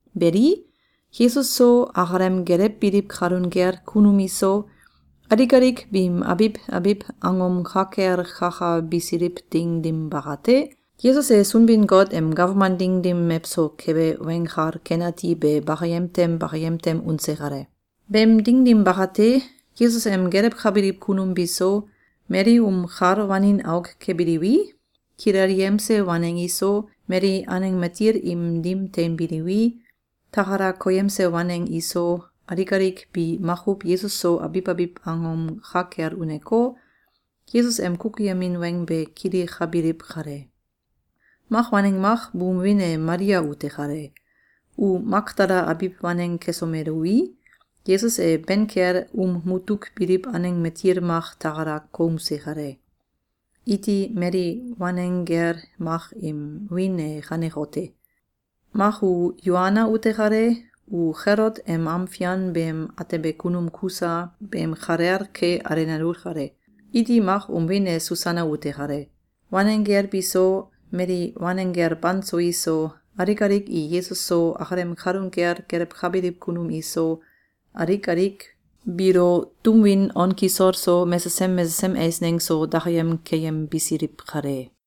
Beli, Yesus so, akalem gelewbiliw kalun kel kunum iso, alik alik biim abiw abiw angom ka kel kakabisiliw ding dim bakate, Yesus e Sunbin-Got em gawman ding dim mewso kebe Weng Kal Ken Ati be bakayem tem bakayem tem unse kale. Beem ding dim bakate, Yesus em gelewkabiliw kunum biso, mali um kal wanin auk kebiliwi, kilelyemse waneng iso, mali aneng matil im dim teinbiliwi, takala koyemse waneng iso, alik alik bi makuw Yesus so abiw abiw angom ka kel uneko, Yesus em kukuyemin weng be kilikabiliw kale. Mak waneng mak buum wiin e Malia ute kale. U Makdala abiw waneng kesomelui, Yesus e ben kel um mutuk biliw aneng matil mak takala koumse kale. Iti mali wanenggel mak im wiin e kanekote: Mak u Yoana ute kale. U Kelot em am fian beem atebe kunum Kusa beem kalel ke alenalu kale. Iti mak um wiin e Susana ute kale. Wanenggel biso, mali wanenggel banso iso, alik alik i Yesus so, akalem kalun kel gelewkabiliw kunum iso, alik alik biilo tum win on kisol so, mesesem mesesem eisneng so, dakayem keyembisiliw kale.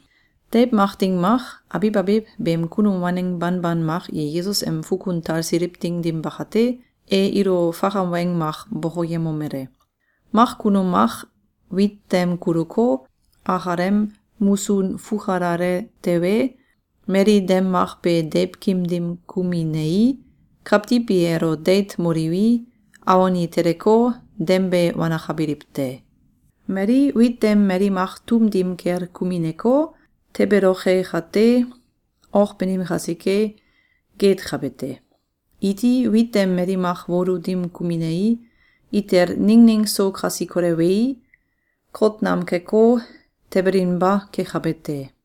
Deiw mak ding mak, abiw abiw beem kunum waneng banban mak i Yesus em fukun talsiliw ding dim bakate, e ilo fakam weng mak bokoyemomele: “Mak kunum mak wit dem kuluko, akalem musun fukalale tewe, mali dem mak be deiwkim dim kuminei, kawtiw i elo deit moliwi, awon i teleko, dem be wanakabiliw te. Mali wit dem mali mak tum dim kel kumineko, tebeloke kate, ok banim kasike, geetkabe te. Iti wit dem mali mak wolu dim kuminei, itel ningning so kasi kolewei, kot nam keko, tebelinba kekabe te.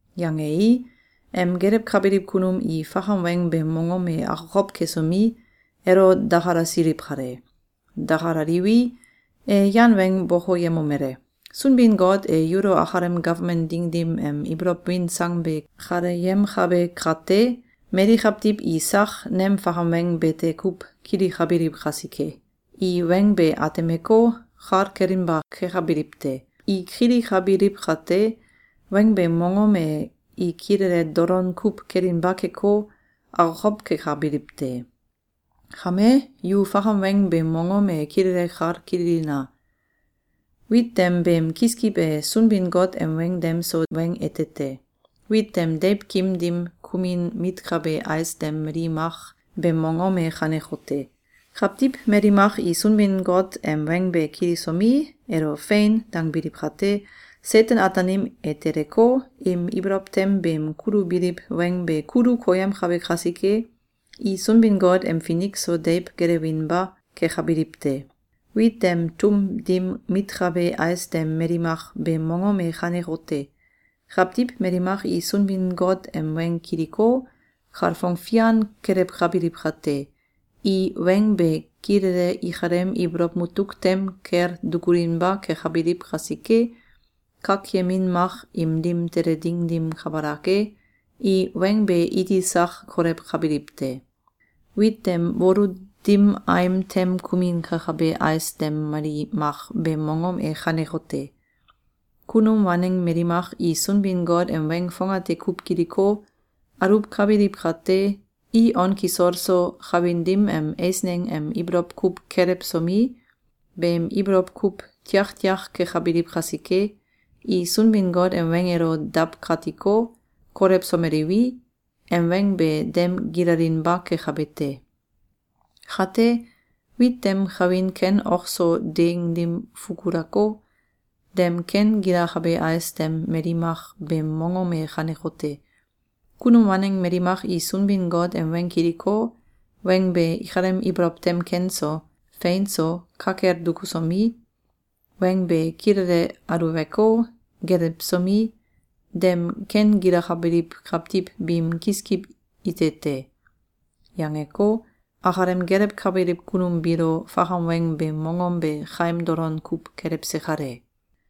Yangei, em gelewkabiliw kunum i fakam weng beem mongom e akokow kesomi, elo dakalasiliw kale. Dakalaliwi, e yan weng bokoyemomele: “Sunbin-Got e yulo akalem gawman ding dim em ibolow win sang be kaleyemkabe kate, mali kawtiw i sak nem fakam weng bete kuw kilikabiliw kasike, ‘i weng be atemeko, kal kelinba kekabiliw te. I kilikabiliw kate, weng beem mongom e i kilele dolon kuw kelinba keko, akokow kekabiliw te.’ Kame, yu fakam weng beem mongom e kilele kal kililina! Wit dem beem kiskiw e Sunbin-Got em weng dem so weng ete te. Wit dem deiwkim dim kumin mitkabe ais dem mali mak beem mongom e kanekote: Kawtiw mali mak i Sunbin-Got em weng be kilisomi, elo “Fein!”, dangbiliw kate, Seten-Ataanim e teleko, im ibolow tem beem kulubiliw weng be kulu koyemkabe kasike, i Sunbin-Got em finik so deiw gelewinba kekabiliw te. Wit dem tum dim mitkabe ais dem mali mak beem mongom e kanekote: Kawtiw mali mak i Sunbin-Got em weng kiliko, kalfong fian kelewkabiliw kate, i weng be kilele ikalem ibolow mutuk tem kel dukulinba kekabiliw kasike, kakyemin mak im dim tele ding dim kabalak e, i weng be iti sak kolewkabiliw te. Wit dem wolu dim aim tem kumin kekabe ais dem mali mak beem mongom e kanekote: Kunum waneng mali mak i Sunbin-Got em weng fongate kuw kiliko, aluwkabiliw kate, i on kisol so, kawin dim em eisneng em ibolow kuw kelewsomi, beem ibolow kuw tiaktiak kekabiliw kasike, i Sunbin-Got em weng elo dawkatiko, kolewsomeliwi, em weng be dem gilalinba kekabe te. Kate, wit dem kawin ken ok so deeng dim fukulako, dem ken gilakabe ais dem mali mak beem mongom e kanekote: Kunum waneng mali mak i Sunbin-Got em weng kiliko, weng be ikalem ibolow tem ken so, fein so, ka kel dukusomi, weng be kilele aluweko, gelewsomi, dem ken gilakabaliw kawtiw biim kiskiw ite te.”, yangeko, akalem gelewkabiliw kunum biilo fakam weng beem mongom be kaim dolon kuw kelewse kale.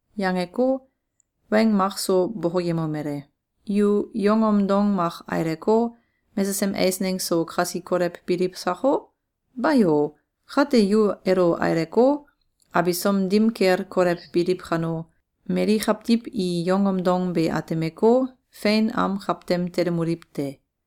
Yangeko, weng mak so bokoyemomele: “Yu yongom dong mak aileko, mesesem eisneng so kasi kolewbiliw sako? Bayo! Kate yu elo aileko, abisom dim kel kolewbiliw kano, mali kawtiw i yongom dong be atemeko, fein am kawtem telemoliw te.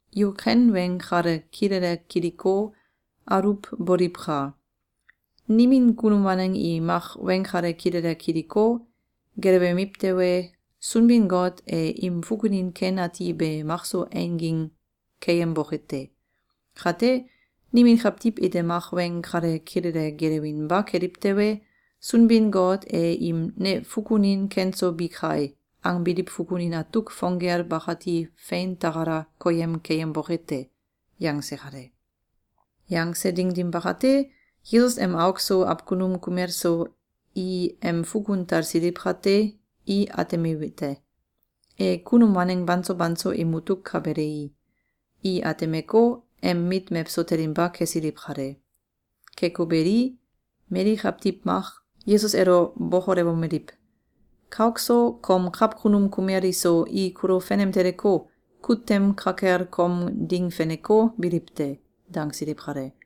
Yu ken weng kale kilele kiliko, aluwboliwka! Nimin kunum waneng i mak weng kale kilele kiliko, gelewemiw tewe, Sunbin-Got e im fukunin ken ati be makso einging keyemboke te. Kate, nimin kawtiw ite mak weng kale kilele gelewinba keliw tewe, Sunbin-Got e im ‘Ne fukunin ken so bi kai!’, angbiliw fukunin atuk fong gel bakati fein takala koyem keyemboke te.”, yangse kale. Yangse ding dim bakate, Yesus em auk so awkunum kumel so i em fukun talsiliw kate, i atemiwete: E kunum waneng banso banso im mutuk ka belei, i atemeko, em mit mewso telinba kesiliw kale. Keko beli, mali kawtiw mak Yesus elo bokolewomeliw: “Kauk so, kom kawkunum kumel iso, i kulo fenem teleko, kut tem ka kel kom ding feneko, biliw te.”, dangsiliw kale.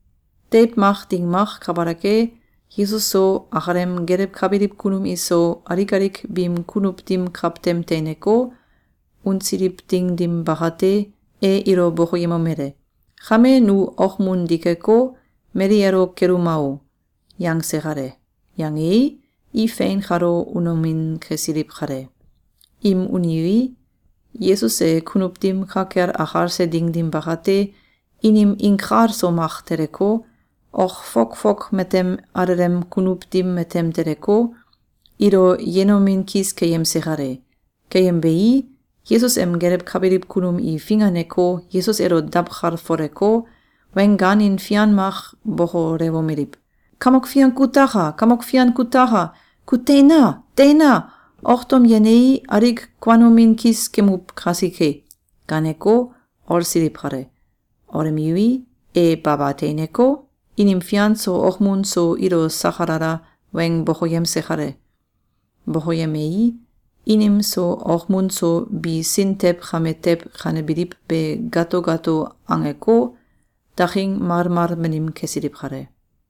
Deiw mak ding mak kabalak e, Yesus so, akalem gelewkabiliw kunum iso, alik alik biim kunuw dim kawtem teineko, unsiliw ding dim bakate, e ilo bokoyemomele: “Kame nu okmun dikeko, mali elo keluma o!”, yangse kale. Yangei, i fein kalo unomin kesiliw kale. Im uniwi, Yesus e kunuw dim ka kel akalse ding dim bakate, inim inkal so mak teleko, ok fok fok matem alelem kunuw dim matem teleko, ilo yenomin kis keyemse kale. Keyembei, Yesus em gelewkabiliw kunum i finganeko, Yesus elo dawkalfoleko, weng gaanin fian kuw bokolewomeliw: “Kamok Fian kutaka! Kamok Fian kutaka! Ku teina! Teina! Ok tom yenei, alik kuanomin kis kemuw kasike!”, gaaneko, olsiliw kale. Olemiwi, e baba teineko, inim fian so okmun so ilo sakalala weng bokoyemse kale. Bokoyemei, inim so okmun so bi sin tew kame tew kanebiliw be gato gato angeko, daking malmal banim kesiliw kale.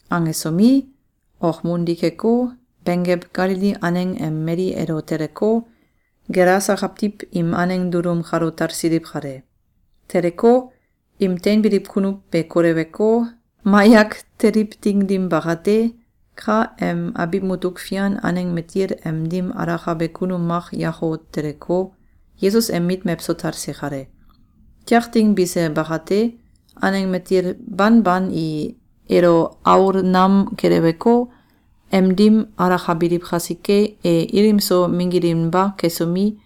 Angesomi, okmun dikeko, benggew Galili aneng em mali elo teleko, Gelasa kawtiw im aneng dulum kalo talsiliw kale. Teleko, im teinbiliw kunuw be koleweko, mayak teliw ding dim bakate, ka em abiw mutuk fian aneng matil em dim alakabe kunum mak yako teleko, Yesus em mit mewso talse kale. Tiak ding bise bakate, aneng matil banban i elo aol nam keleweko, em dim alakabiliw kasike, e ilim so minggilinba kesomi,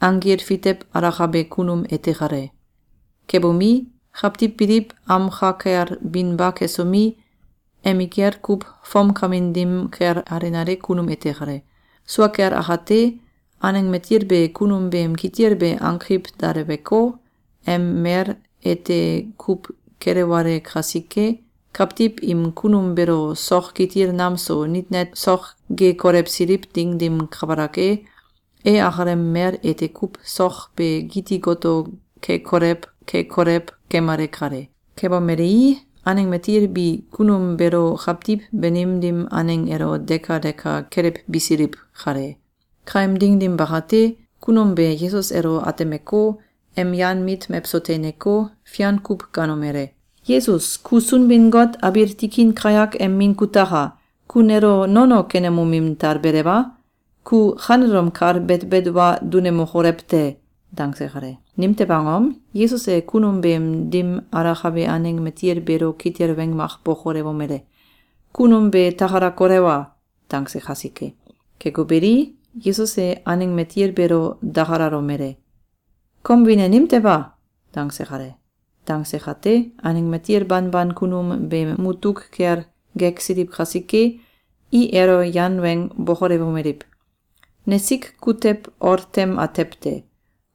anggil fitew alakabe kunum ete kale. Kebomi, kawtiw biliw am ka kel binba kesomi, emikel kuw fomkamin dim kel alenale kunum ete kale. Sua kel akate, aneng matil be kunum beem kitil be ankiw daleweko, em mel ete kuw kelewale kasike, kawtiw im kunum beelo sok kitil nam so nit net sok ge kolewsiliw ding dim kabalak e, e akalem mel ete kuw sok be giti goto ke kolew ke kolew kemale kale. Kebomelei, aneng matil bi kunum beelo kawtiw banim dim aneng elo deka deka kelewbisiliw kale. Kaem ding dim bakate, kunum be Yesus elo atemeko, em yan mit mewso teineko, fian kuw gaanomele: “Yesus, ku Sunbin-Got abiil tikin kayak em min kutaka! Ku nelo nono kenemomin talbelew a? Ku kanelom kal betbet wa dunemokolew te!”, dangse kale. Nimtew angom? Yesus e kunum beem dim alakabe aneng matil beelo kitil weng mak bokolewomele: “Kunum be takala kolewa!”, dangse kasike. Keko beli, Yesus e aneng matil beelo dakalalomele: “Kom wiin e nimtew a?”, dangse kale. Dangse kate, aneng matil banban kunum beem mutuk kel geksiliw kasike, i elo yan weng bokolewomeliw: “Nesik kutew ol tem atew te.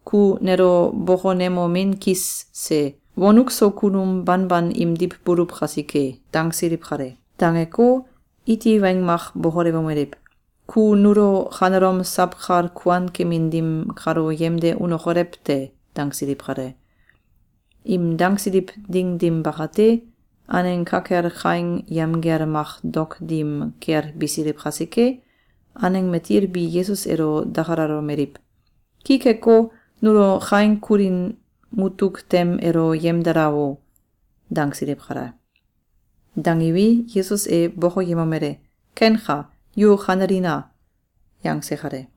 Ku nelo bokonemomin kis se. Wonuk so kunum banban imdiw buluw kasike!”, dangsiliw kale. Dangeko, iti weng mak bokolewomeliw: “Ku nulo kanelom sawkal kuan kemin dim kalo yemde unokolew te!”, dangsiliw kale. Im dangsiliw ding dim bakate, aneng ka kel kaing yamgel mak dok dim kel bisiliw kasike, aneng matil bi Yesus elo dakalalomeliw: “Ki keko, nulo kaing kulin mutuk tem elo yemdala o!”, dangsiliw kale. Dangiwi, Yesus e bokoyemomele: “Kenka. Yu kanelina!”, yangse kale.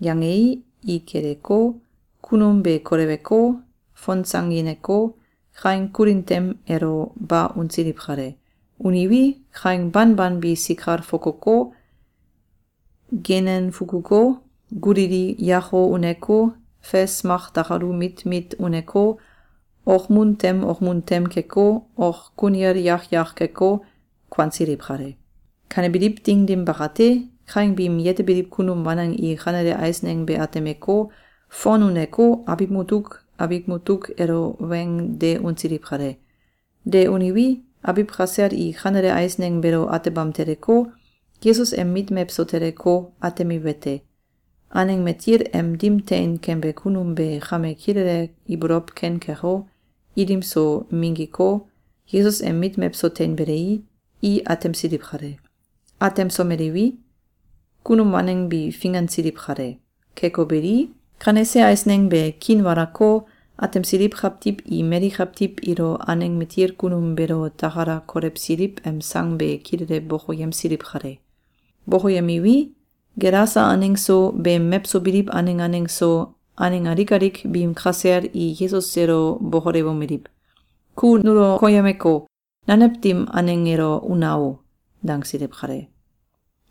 Yangei, i kiliko, kunum be koleweko, fonsangineko, kaing kulin tem elo ba unsiliw kale. Uniwi, kaing banban bi sikal fokoko, genem fukuko, gulili yako uneko, fes mak dakalu mit mit uneko, okmun tem okmun tem keko, ok kunil yak yak keko, kuansiliw kale. Kanebiliw ding dim bakate, kaing biim yetebiliw kunum waneng i kanele eisneng be atemeko, fon uneko, abiw mutuk abiw mutuk elo weng de unsiliw kale. De uniwi, abiw kasel i kanele eisneng beelo atebam teleko, Yesus em mit mewso teleko, atemiwete: Aneng matil em dim tein kembe kunum be kame kilele ibolow ken keko, ilim so minggiko, Yesus em mit mewso teinbelei, i atemsiliw kale. Atemsomeliwi, kunum waneng bi fingansiliw kale. Keko beli, kanese eisneng be kiinwalako, atemsiliw kawtiw i mali kawtiw ilo aneng matil kunum beelo takala kolewsiliw em sang be kilele bokoyemsiliw kale. Bokoyemiwi, Gelasa aneng so, beem mewso biliw aneng aneng so, aneng alik alik biim kasel i Yesus elo bokolewomeliw: “Ku nulo koyemeko, nanew dim aneng elo una o!”, dangsiliw kale.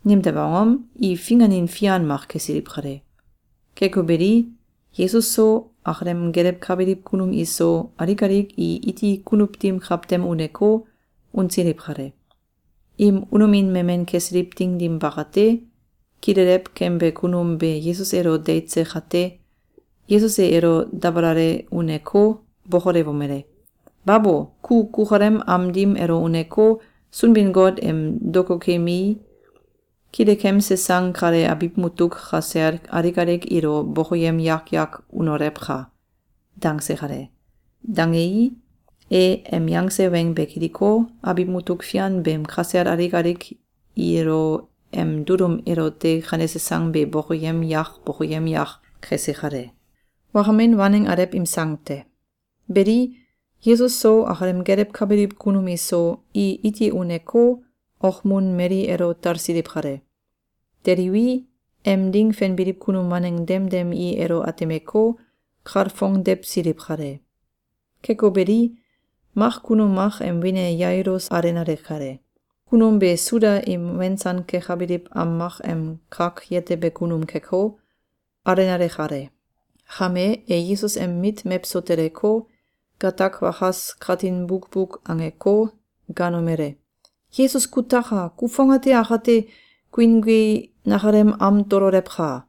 Nimtew angom? I finganin fian mak kesiliw kale. Keko beli, Yesus so, akalem gelewkabiliw kunum iso, alik alik i iti kunuw dim kawtem uneko, unsiliw kale. Im unomin memen kesiliw ding dim bakate, kilelew kembe kunum be Yesus elo deitse kate, Yesus e elo dabalale uneko, bokolewomele: “Babo! Ku kukalem am dim elo uneko, Sunbin-Got em dokokemei, kilekemse sang kale abiw mutuk kasel alik alik ilo bokoyem yak yak unolewka!”, dangse kale. Dangei, e em yangse weng be kiliko, abiw mutuk fian beem kasel alik alik ilo em dulum elote kanese sang be bokoyem yak bokoyem yak kese kale. Wakamin Waneng Alew im Sang te. Beli, Yesus so, akalem gelewkabiliw kunum iso, i iti uneko, okmun mali elo talsiliw kale. Teliwi, em ding fenbiliw kunum waneng demdem i elo atemeko, kalfongdewsiliw kale. Keko beli, mak kunum mak em wiin e Yailus alenale kale. Kunum be Suda im wensan kekabiliw am mak em kak yetebe kunum keko, alenale kale. Kame, e Yesus em mit mewso teleko, gatak wakas katin bukbuk angeko, gaanomele: “Yesus kutaka! Ku fongate akate guingui nakalem am tololewka!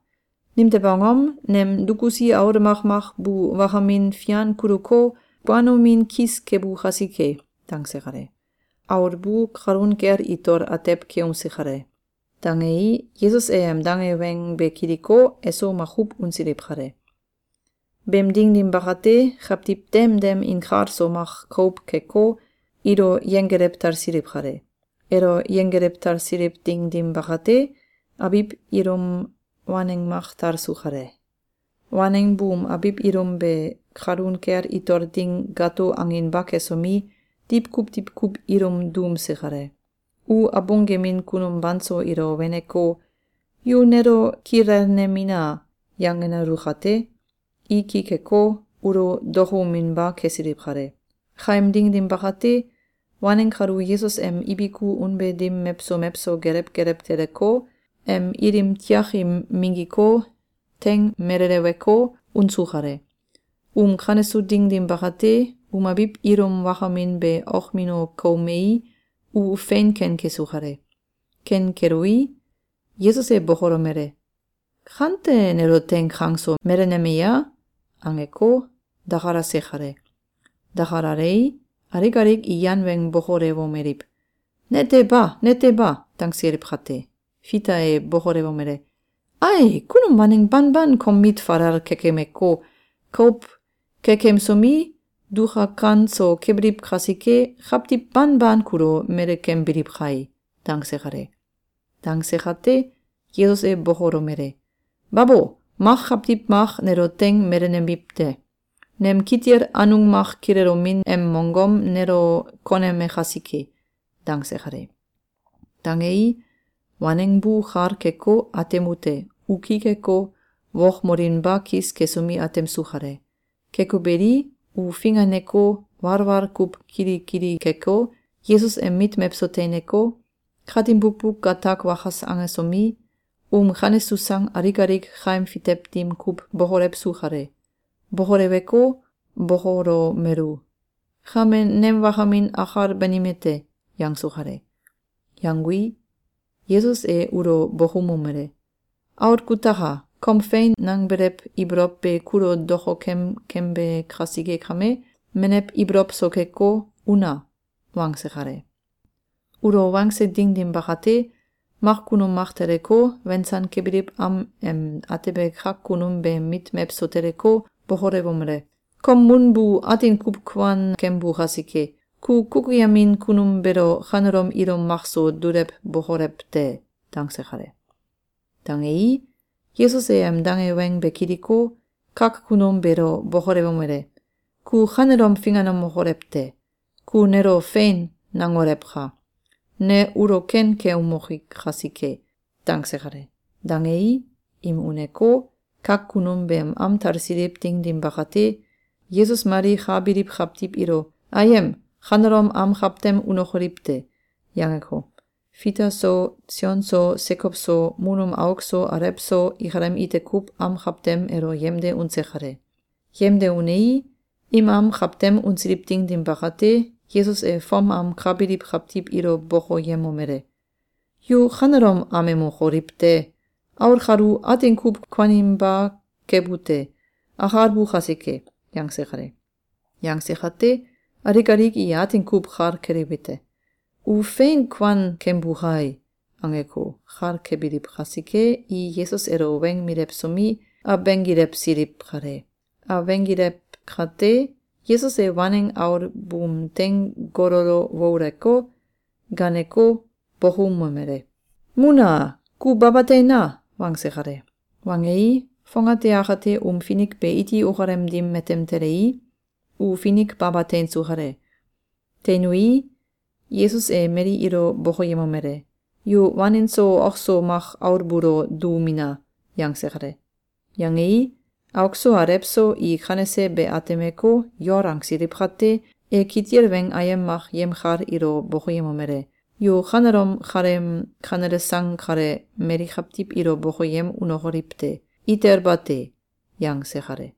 Nimtew angom? Nem dukusi aul makmak bu wakamin fian kuluko, kuanomin kis kebu kasike.”, dangse kale. (Aul bu kalun kel itol atew keumse kale.) Dangei, Yesus e em dange weng be kiliko, eso makuw unsiliw kale. Beem ding dim bakate, kawtiw dem dem inkalso mak kouw keko, ilo yenggelew talsiliw kale. Elo yenggelew tasiliw ding dim bakate, abiw ilum waneng mak talsu kale. Waneng buum abiw ilum be kalun kel itol ding gato anginba kesomi, diwkuw diwkuw ilum duumse kale. U abung gemin kunum banso ilo weneko, “Yu nelo kilelnemina!”, yangenalu kate, i ki keko, ulo dokouminba kesiliw kale. Kaem ding dim bakate, waneng kalu Yesus em ibiku unbe dim mewso mewso gelew gelew teleko, em ilim tiakim minggiko, teing meleleweko, unsu kale. Um kanesu ding dim bakate, um abiw ilum wakamin be okmino koumei, u fein ken kesu kale. Ken kelui, Yesus e bokolomele: “Kante nelo teing kang so meleneme ya?”, angeko, dakalase kale. Dakalalei, alik alik i yan weng bokolewomeliw: “Nete ba! Nete ba!”, dangsiliw kate, Fita e bokolewomele: “Ae! Kunum waneng banban kom mit falal kekemeko, kouw kekemsomi, dukakan so kebiliw kasike, kawtiw banban kulo melekembiliw kai!”, dangse kale. Dangse kate, Yesus e bokolomele: “Babo! Mak kawtiw mak nelo teing melenemiw te. Nem kitil anung mak kilelomin em mongom nelo koneme kasike.”, dangse kale. Dangei, waneng bu kal keko, atemute: U ki keko, wokmolinba kis kesomi, atemsu kale. Keko beli, u finganeko, walwal kuw kilikili keko, Yesus em mit mewso teineko, katin bukbuk gatak wakas angesomi, um kanesu sang alik alik kaim fitew dim kuw bokolewsu kale. Bokoleweko, bokolomelu: “Kame nem wakamin akal banime te!”, yangsu kale. Yangui, Yesus e ulo bokoumomele: “Aul kutaka! Kom fein nangbelew ibolow be kulo dokokem kembe kasike kame, menew ibolow so keko, una!”, wangse kale. Ulo wangse ding dim bakate, mak kunum mak teleko, wensan kebiliw am em atebe kak kunum beem mit mewso teleko, bokolewomele: “Kom mun bu atin kuw kuan kembu kasike, ku kukuyemin kunum beelo kanelom ilum makso dulewbokolew te!”, dangse kale. Dangei, Yesus e em dange weng be kiliko, kak kunum beelo bokolewomele: “Ku kanelom finganemokolew te! Ku nelo ‘Fein!’, nangolewka! Ne ulo ken keumoki kasike.”, dangse kale. Dangei, im uneko, kak kunum beem am talsiliw ding dim bakate, Yesus mali ka biliw kawtiw ilo “Ayem! Kanelom am kawtem unokoliw te!”, yangeko, Fita so, Sion so, Sekow so, mun um auk so alew so, ikalem ite kuw am kawtem elo yemde unse kale. Yemde unei, im am kawtem unsiliw ding dim bakate, Yesus e fom am ka biliw kawtiw ilo bokoyemomele: “Yu kanelom amemokoliw te! Aul kalu atin kuw kuaninba kebu te. Akalbu kasike!”, yangse kale. Yangse kate, alik alik i atin kuw kal keliwete: “U fein kuan kembu kai!”, angeko, kal kebiliw kasike, i Yesus elo weng milewsomi, abenggilewsiliw kale. Abenggilew kate, Yesus e waneng aul buum teing gololo wouleko, gaaneko, bokoumomele: “Mun a! Ku baba teina!”, wangse kale. Wangei, fongate akate um finik be iti ukalem dim matem telei, u finik baba teinsu kale. Teinui, Yesus e mali ilo bokoyemomele: “Yu wanin so ok so mak aul buulo duumina!”, yangse kale. Yangei, auk so alew so i kanese be atemeko, yol angsiliw kate, e kitil weng ayem mak yemkal ilo bokoyemomele: “Yu kanelom kaleem kanele sang kale mali kawtiw ilo bokoyem unokoliw te! Itel bate!”, yangse kale.